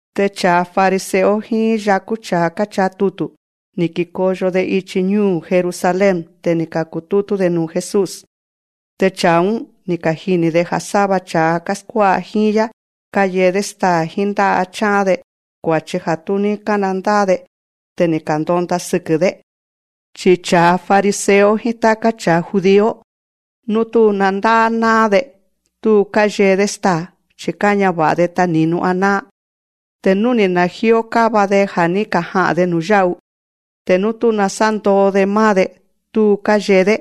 Te cha̱a fariseo jíín yakú cha̱a káchaa tutu̱, ni̱ kikoyo‑de ichi ñúu̱ Jerusalén. Te ni̱ ka̱kutútú‑de nuu̱ Jesús. Te cha̱a‑ún, ni̱ kajini̱‑de ja̱ sáva cha̱a káskuá'a jíín‑yá káyee‑dé staa̱ jíín ndá'a chá'án‑de, kua̱chi ja̱ tú ní ka̱nandá'á‑de. Te ni̱ ka̱ndonda sɨkɨ̱‑dé. (Chi cha̱a fariseo jíín táká cha̱a judío, nú tú nandá'á ná'án‑de, tú káyee‑dé staa̱. Chi̱ káñava̱'a‑de tani̱nu aná'án. Te nú ni̱ ka̱najíó káva‑de ja̱ ní kaja'a̱n‑de nu̱yá'u, te nú tú nasándoo‑de máá‑de, tú káyee‑dé.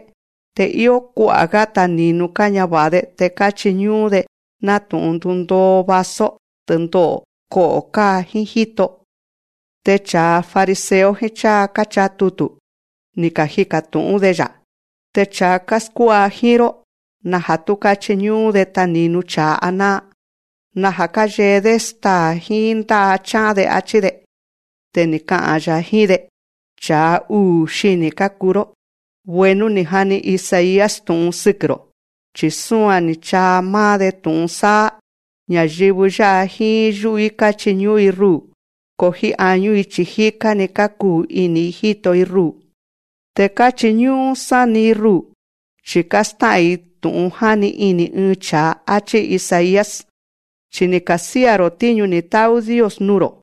Te íó kua'a̱‑gá tani̱nu káñava̱'a‑de te káchiñú'ún‑de, nátu̱'un ndúndoo vaso, tɨndo'o̱, ko'o̱ káa, jíín jíto.) te cha̱a fariseo jíín cháa káchaa tutu̱, ni̱ kajika̱ tu̱'ún‑de‑ya̱. Te cha̱a káskuá'a jíín‑ró, naja̱ tú káchiñú'ún‑de tani̱nu cha̱a aná'án. Naja̱ káyee‑dé staa̱ jíín ndá'a chá'án‑de, áchí‑de. Te ni̱ ka'a̱n‑ya̱ jíín‑de: Cha̱a uu̱ xini̱ kákuu‑ró. Bueno ni̱ jani Isaías tu̱'un sɨkɨ̱‑ro̱, chi̱ súan ni̱ chaa máá‑de tu̱'un sáá: Ña̱yɨvɨ yá'a jíín yú'u‑í káchiñú'ún‑i ruu̱, ko jíín añú‑i chi̱ jíká‑ni kákuu ini̱‑i jíto‑i ruu̱. Te káchiñú'ún sáni‑i ruu̱, chi̱ kástá'a̱n‑i tu̱'un jáni ini̱ ɨɨn cha̱a, áchí Isaías. Chi ni̱ ka̱sía̱‑ro̱ tíñu ni̱ tá'ú Dios nuu̱‑ro̱,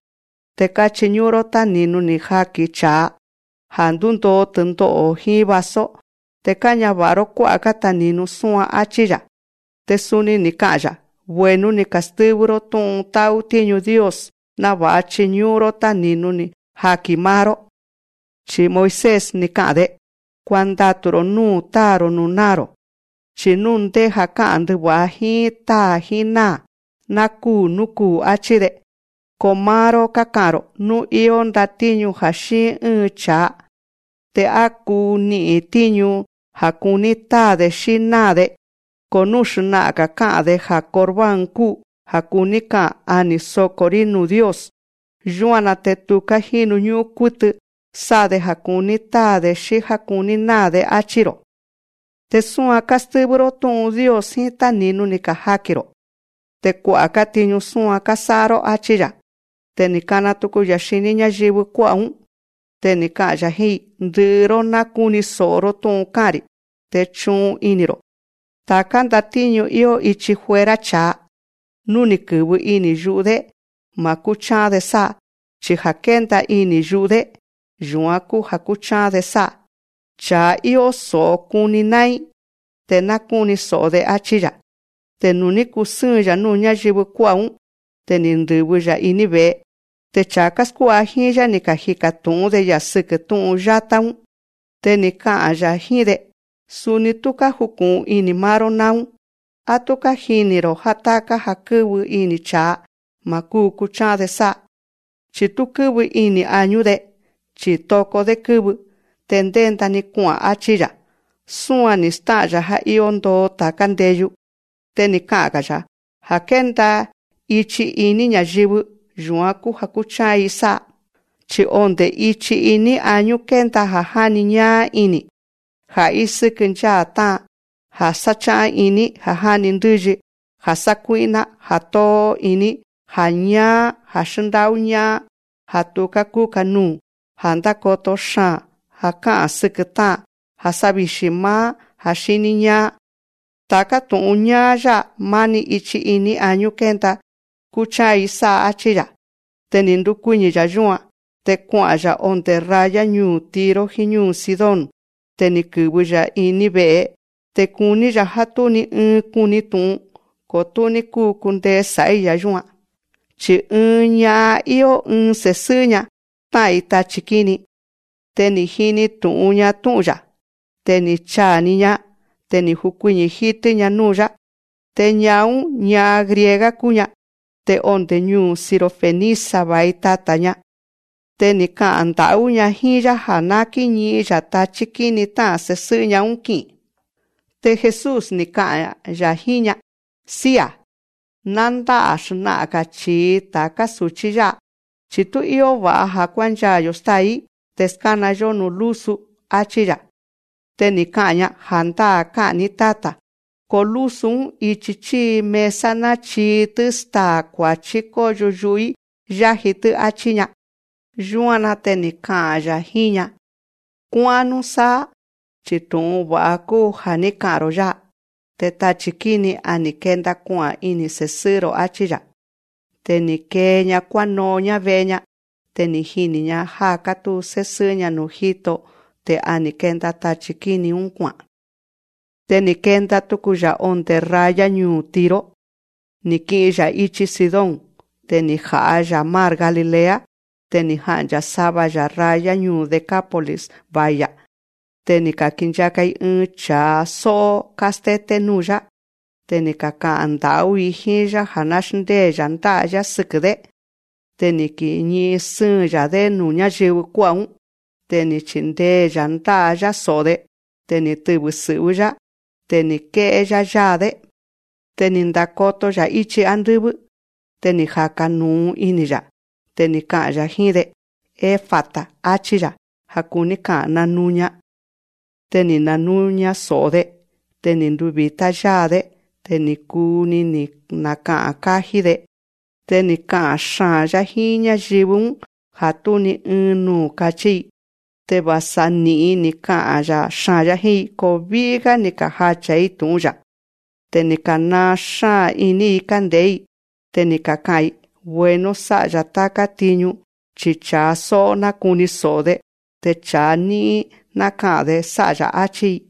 te káchiñú'ún‑ró táni̱nu ni̱ kajaki̱n cha̱a, ja̱ ndúndoo tɨndo'o̱ jíín vaso. Te káñava̱'a‑ró kuá'a̱‑gá tani̱nu súan, áchí‑ya̱. Te suni ni̱ ka'a̱n‑ya̱: Bueno‑ni kástɨ́vɨ́‑ró tú'un tá'ú tíñu Dios náva̱'a chiñú'ún‑ró táni̱nu ni̱ kajaki̱n máá‑ró. Chi̱ Moisés, ni̱ ka'a̱n‑de: Kuandatu̱‑ro̱ núu̱ táa̱‑ro̱ núu̱ náa̱‑ro̱. Chi̱ nú ndéja̱ ká'a̱n ndɨva̱'a jíín táa̱ jíín náa̱, ná kúu̱ nú kuu̱. Achí‑de. Ko máá‑ró káka'a̱n‑ro̱: Nú íó ndatíñu ja̱ xíin ɨ́ɨn cha̱a. Te a kuu ni'i̱n tíñu ja̱ kuní táa̱‑de xí náa̱‑de, ko nú xna'a̱n‑ga̱ ka'a̱n‑de ja̱ Corbán kúu (ja̱ kuní ka'a̱n, a ni̱ soko̱‑rí nuu̱ Dios), yúan‑na te tuká jínu ñú'ún kútɨ sá'a‑de ja̱ kuní táa̱‑de xí já kuní náa̱‑de, áchí‑ro̱. Te súan kástɨ́vɨ́‑ró tú'un Dios jíín táni̱nu ni̱ kajaki̱n‑ro̱. Te kua'a̱‑gá tiñu súan kásá'a‑ró, áchí‑ya̱. Te ni̱ kana tuku‑ya̱ xiní ñáyɨvɨ kuá'a̱‑ún. Te ni̱ ka'a̱n‑ya̱ jíín‑i: Ndɨ'ɨ‑ró ná kúni so̱'o‑ró tú'un ká'a̱n‑ri̱, te chu'un ini̱‑ro̱. Ta̱ká ndatíñu íó ichi fuera cha̱a, nú ni̱ kɨ̱vɨ ini̱ yu'u‑dé, ma̱ kúchá'án‑de sá'a. Chi ja̱ kénda ini̱ yu'u‑dé, yu̱án kúu ja̱ kúchá'án‑de sá'a. Cha̱a íó so̱'o kuni ná'ín, te ná kúni so̱'o‑de, áchí‑ya̱. Te nuu̱ ní kusɨ́ɨn‑ya̱ núu̱ ñáyɨvɨ kuá'a̱‑ún, te ni̱ ndɨ̱vɨ‑ya̱ iní ve̱'e. Te cha̱a káskuá'a jíín‑yá, ni̱ kajika̱ tu̱'ún‑de‑ya̱ sɨkɨ́ tú'un yátá‑ún. Te ni̱ ka'a̱n‑ya̱ jíín‑de: Suni tú kájuku̱'un ini̱ máá‑ró náún. Á tú kájini̱‑ro̱ já táká ja̱ kɨ́vɨ ini̱ cha̱a, ma̱ kúu kuchá'án‑de sá'a, chi̱ tú kɨ́vɨ ini̱ añú‑de, chi̱ toko‑dé kɨ́vɨ, te ndénda‑ni kua'a̱n, áchí‑ya̱. Súan ni̱ stá'a̱n‑ya̱ já íó ndoo ta̱ká ndeyu. Te ni̱ ka'a̱n‑ga̱‑ya̱: Ja̱ kénda ichi iní ña̱yɨvɨ, yu̱án kúu ja̱ kúchá'án‑i sá'a. Chi̱ onde̱ ichi iní añú kénda ja̱ jáni ñáá ini̱, ja̱ ísɨ́kɨ ncháa̱ tá'a̱n, ja̱ kuáxán iní, ja̱ já'ni ndɨ́yi, ja̱ sákuí'ná, ja̱ tóó iní, ja̱ ñáá, ja̱ xndá'ú ñá'án, ja̱ tuká kúka nuu̱, ja̱ ndákoto xaa̱n, ja̱ ká'a̱n sɨkɨ̱ tá'an, ja̱ sávixi̱ máá, ja̱ xiní ñáá. Ta̱ká tu̱'un ñáá yá'a, máni ichi iní añú kénda te kúchá'án‑i sá'a, áchí‑ya̱. Te ni̱ ndukuiñi̱‑ya̱ yúan. Te kua'a̱n‑ya̱ ondé raya ñuu̱ Tiro jíín ñúu̱ Sidón. Te ni̱ kɨ̱vɨ‑ya̱ ɨ́ɨn ve'e. Te kuní‑ya̱ já tú ni ɨɨn kuni tu̱'un. Ko tú ní kúu kundee sá'í‑ya̱ yúan. Chi̱ ɨɨn ña'an íó ɨɨn se̱sɨ́'ɨ́‑ña tá'a̱n‑i tachi̱ kíni. Te ni̱ jini tu̱'un‑ña tú'un‑ya̱. Te ni̱ chaa̱‑ni‑ña. Te ni̱ jukuiñi̱ jítɨ́‑ña núu̱‑yá. Te ña'an‑ún, ña'an griega kúu‑ña. Te onde̱ ñuu̱ Sirofenicia va̱i tata̱‑ña. Te ni̱ ka'a̱n nda̱'ú‑ña jíín‑yá ja̱ ná kíñi'in‑ya̱ tachí kíni tá'a̱n se̱sɨ́'ɨ́‑ña‑ún ki'i̱n. Te Jesús, ni̱ ka'a̱n‑ya̱ jíín‑ña: Sía̱, ná ndá'a̱ xna'a̱n‑ga̱ chi̱i ta̱ká su̱chí yá'a, chi̱ tú íó va̱'a ja̱ kuánchaa̱‑yo̱ stáa̱‑í te skána‑yó núu̱ lúsu, áchí‑ya̱. Te ni̱ ka'a̱n‑ña: Ja̱ndáa̱ ká'a̱n‑ní Táta̱, ko lúsu‑ún ichi chíi mesa náchii‑tɨ́ staa̱ kua̱chí kóyo yu'u‑í yáji‑tɨ́, áchí‑ña. Yúan‑na te ni̱ ka'a̱n‑ya̱ jíín‑ña: Kuá'án núsáá, chi tu̱'un va̱'a kúu ja̱ ní ka'a̱n‑ro̱ yá'a. Te tachi̱ kíni‑ún, a ni̱ kenda kua'a̱n ini̱ se̱sɨ́'ɨ́‑ro̱, áchí‑ya̱. Te ni̱ kee‑ña kuáno'on‑ñá ve'e‑ña. Te ni̱ jini̱‑ña já kátúu sésɨ́'ɨ́‑ña núu̱ jíto. Te a ni̱ kenda tachi̱ kíni‑ún kua'a̱n. Te ni̱ kenda tuku‑ya̱ ondé raya ñuu̱ Tiro, ni̱ kii‑ya̱ íchi Sidón. Te ni̱ jaa̱‑ya̱ mar Galilea. Te ni̱ ja'ncha̱ sava‑ya̱ raya ñuu̱ Decápolis va̱i‑ya̱. Te ni̱ ka̱kinchaka‑i ɨɨn cha̱a só'ó kástété núu̱‑yá. Te ni̱ kaka'a̱n nda̱'ú‑i jíín‑yá ja̱ ná xndée‑ya̱ ndá'a‑yá sɨkɨ̱‑dé. Te ni̱ kiñi'in sɨ́ɨn‑ya̱‑dé nuu̱ ñáyɨvɨ kuá'a̱‑ún. Te ni̱ chindee‑ya̱ ndá'a‑yá so̱'o‑de. Te ni̱ tɨvɨ̱ sɨ̱'vɨ́‑yá. Te ni̱ ké'é‑yá yáa‑dé. Te ni̱ ndakoto‑ya̱ íchi ándɨ́vɨ́. Te ni̱ jaka̱ nu̱u ini̱‑ya̱. Te ni̱ ka'a̱n‑ya̱ jíín‑de: Efata, áchí‑ya̱. Ja̱ kuní ka'a̱n: Nanuña. Te ni̱ nanuña so̱'o‑de. Te ni̱ nduvi̱tá yáa‑dé. Te ni̱ kuu‑ni ni̱ naka'a̱n kájí‑de. Te ni̱ ka'a̱n xaa̱n‑yá jíín ñáyɨvɨ‑ún ja̱ tú ni ɨɨn nuu̱ kachí‑i. Te va̱sa ni̱'in ni̱ ka'a̱n xaa̱n‑yá jíín‑i, ko ví'í‑gá ni̱ kajacha̱‑i tu̱'un‑ya̱. Te ni̱ ka̱naa xáa̱n iní‑i kánde̱'é‑i. Te ni̱ kaka'a̱n‑i: Bueno sá'a‑ya̱ táká tiñu; chi cha̱a só'ó nákuni so̱'o‑de, te cha̱a ñí'ín náka'a̱n‑de sá'a‑ya̱, áchí‑i.